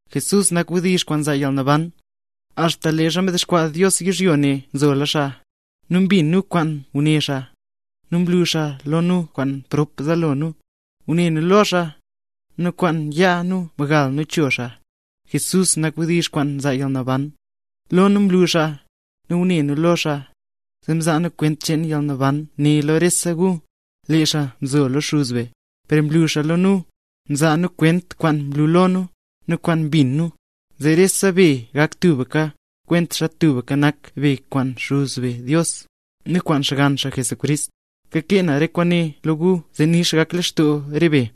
Jesús nak Wdizh kwaan nzaa yalnaban; axta leezha mdexkwaa Dios yizhyo ne nzola xaa. Lee nu mbin kwaan nguné xaa, nu mlu xaa lo nu kwaan prop zaalo nu. Ngune nu lo xaa, nu kwaan yaa nu mgal nu cho xaa. Jesús nak Wdizh kwaan nzaa yalnaban, lo nu mlu xaa, nu ngune nu lo xaa, zee nzaa nu kwent cheen yalnaban ne lo rese gu. Lee xaa mzo lo Xuz be, per mlu xaa lo nu. Nzaa nu kwent kwaan mlu lo nu, nu kwaan mbin nu, zee rese be gak tubka, kwentaxa tubka nak be kwaan Xuz be Dios, nu kwaan Xgann xaa, Jesucrist. Kakee nu re kwaane lo gu zee nix gak lextoo re be.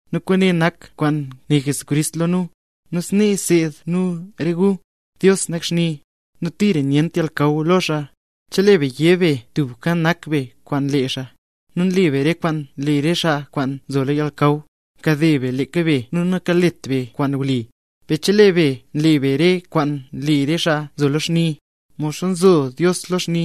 Nu kwaane nak kwaan né Jesucrist lo re nu, nu snee nseed nu re gu: Dios nak xni, nu tira nyent yalnakaw lo xaa. Chelee be yé be, tubka nak be kwaan lee xaa, nu nle be re kwaan nle re xaa kwaan nzo lo yalnakaw, nkade be leeka be nu nakalet be kwaan wli. Per chelee be nle be re kwaan nle re xaa nzo lo xni, modxa nzo Dios lo xni,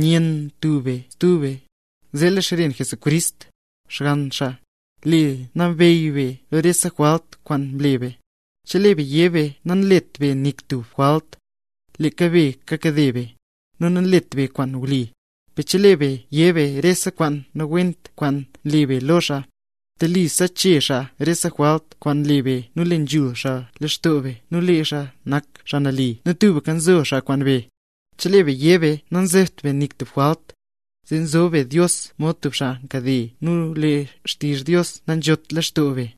nyenn tub be stub be, zee lee xren Jesucrist, Xgann xaa, le nambey re be lo rese jwalt kwaana mle be. Chelee be yé be, namlet be nik tub jwalt, leeka be kakade be, nu nanlet be kwaan wli. Per chelee be yé be rese kwaan nawent kwaan mle be lo xaa, telisa chee xaa rese jwalt kwaan mle be nu le nzhul xaa lextoo be nel lee xaa nak xaa nali nu tubka nzo xaa kwaan be. Chelee be yé be, nanzebt be nik tub jwalt, zee nzob be Dios mod tub xaa nkade nu lee xtizh Dios nanzhot leen lextoo be.